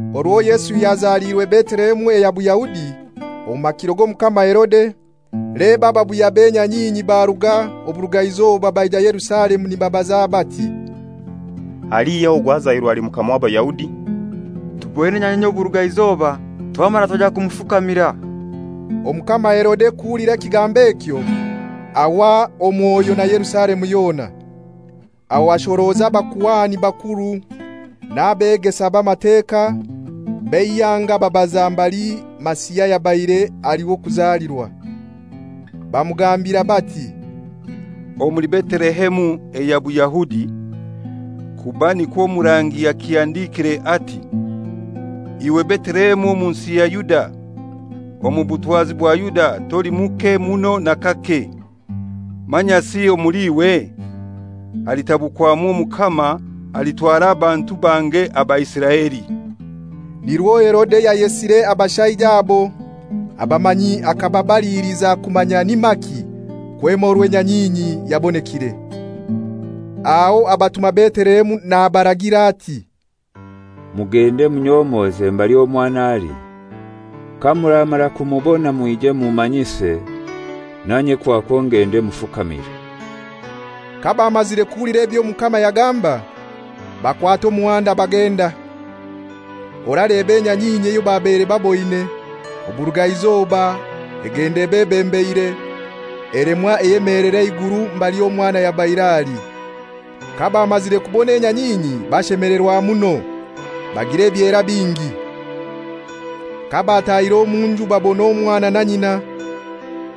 Orwo Yesu yazaliirwe Betelehemu eya Buyahudi omu makiro g'Omukama Herode, leba, ababuya b'enyanyinyi baruga oburugaizoba baija Yerusalemu nibabaza bati, «Alihai ogwo azairwe ali mukama w'Abayahudi? Tuboine enyanyinyi y'oburugaizoba, twamara twaija kumufukamira.» Omukama Herode kuhulira ekigambo ekyo, ahwa omwoyo na Yerusalemu yona. Aho ashoroza abakuhani bakuru n'abegesa b'Amateka b'eihanga ababaza mbali Masiha yabaire ali w'okuzalirwa. Bamugambira bati, «Omuli Betelehemu eya Buyahudi; kuba nikwo omurangi yakihandikire ati, ‹Iwe Betelehemu omu nsi ya Yuda, omu butwazi bwa Yuda toli muke muno n'akake; manyasi omuli iwe halitabukwamu omukama alitwara abantu bange aba Isiraeli.›» Nirwo Herode yayesire abashaija abo abamanyi akababaliiliza kumanya ni maki kwema orwo enyanyinyi yabonekire. Aho abatuma Betelehemu nabaragira ati, «Mugende munyomoze mbali omwana ali. Kamuramara kumubona mwije mummanyise, nanye kwakwo ngende mufukamire.» Kabamazire kuhulira eby'omukama yagamba, bakwata omuhanda bagenda. Oraleba, enyanyinyi eyo babaire baboine oburugaizoba egenda ebebembeire, elemwa eyemeelera eiguru mbali omwana yabaire ali. Kabamazire kubona enyanyinyi bashemelerwa muno, bagira ebyera bingi. Kabatahire omu nju babona omwana na nyina,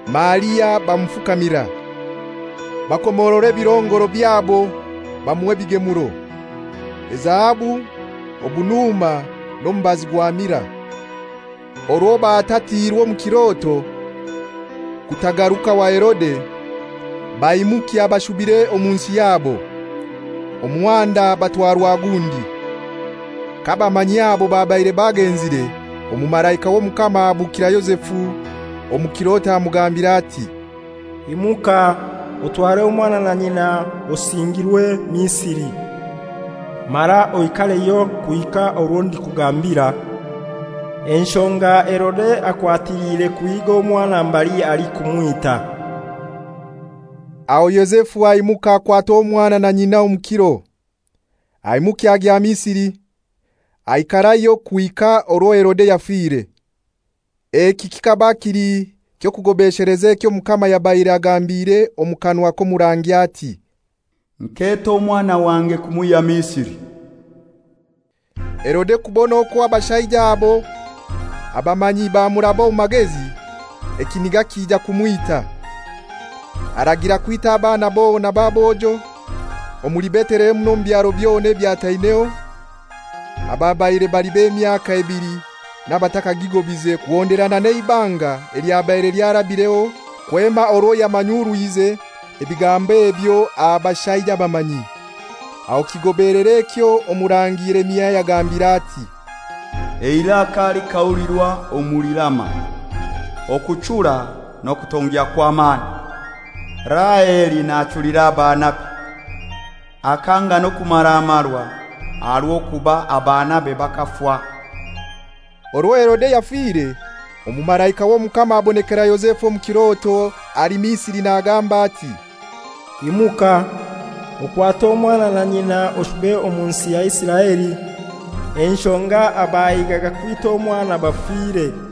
Maria, bamufukamira. Bakomorora ebirongoro byabo bamuha ebigemuro: ezahabu, obunuma n'omubazi gwa mirai. Orwo batatiirwe omu kiroto kutagaruka wa Herode, baimukya bashubire omu nsi yabo, omuhanda batwarwa gundi. Kababaire bagenzire, omumalaika w'Omukama ahabukira Yozefu omu kiroto amugambira ati, «Imuka, otware omwana na nyina osingirwe Misiri, mara oikareyo kuhika orwo ndikugambira; enshonga Herode akwatiliire kuhiiga omwana mbali ali kumwita.» Aho Yozefu aimuka akwata omwana na nyina omu kiro, aimukya agya Misiri, aikarayo kuhika orwo Herode yafire. Eki kikaba kili ky'okugobesheleza ekyo Omukama yabaire agambire omu kanwa k'omurangi ati, «Nketa omwana wange kumwihya Misiri.» Herode kubona okwo abashaija abo abamanyi bamuraba omu magezi, ekiniga kija kumwita, aragira kwita abaana bona b'abojo omuli Betelehemu n'omu byaro byona ebyataineho ababaire bali b'emyaka ebili n'abatakagigobize, kuhonderana n'eibanga elyabaire lyarabireho kwema orwo yamanyurwize ebigambo ebyo aha bashaija abamanyi. Aho kigobelera ekyo Omurangi Yeremia yagambire ati, «Eiraka likahulirwa omuli Rama, okuchura n'okutongya kw'amani, Raheli nachulira abaanabe, akanga n'okumaramarwa, aha rw'okuba abaanabe bakafa.» Orwo Herode yafire, omumalaika w'Omukama abonekera Yozefu omu kiroto ali Misiri nagamba ati, «Imuka, okwate omwana na nyina oshube omu nsi ya Isiraeli, enshonga abahigaga kwita omwana bafire.»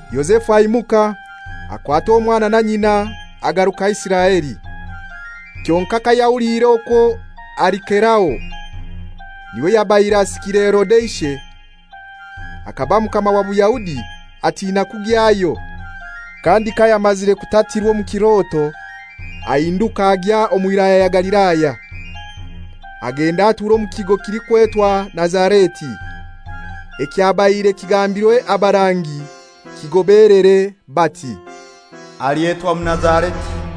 Yozefu aimuka, akwata omwana na nyina, agaruka Isiraeli. Kyonkai kayahuliire okwo Arikelao niwe yabaire asikiire Herode ishe, akaba mukama wa Buyahudi, atina kugyayo, kandi kayamazire kutatirwa omu kiroto, ahinduka agya omu Wilaya ya Galilaya. Agenda atura omu kigo kilikwetwa Nazareti; ekyabaire kigambirwe abarangi kigobelere, bati, «Alyetwa Munazareti.»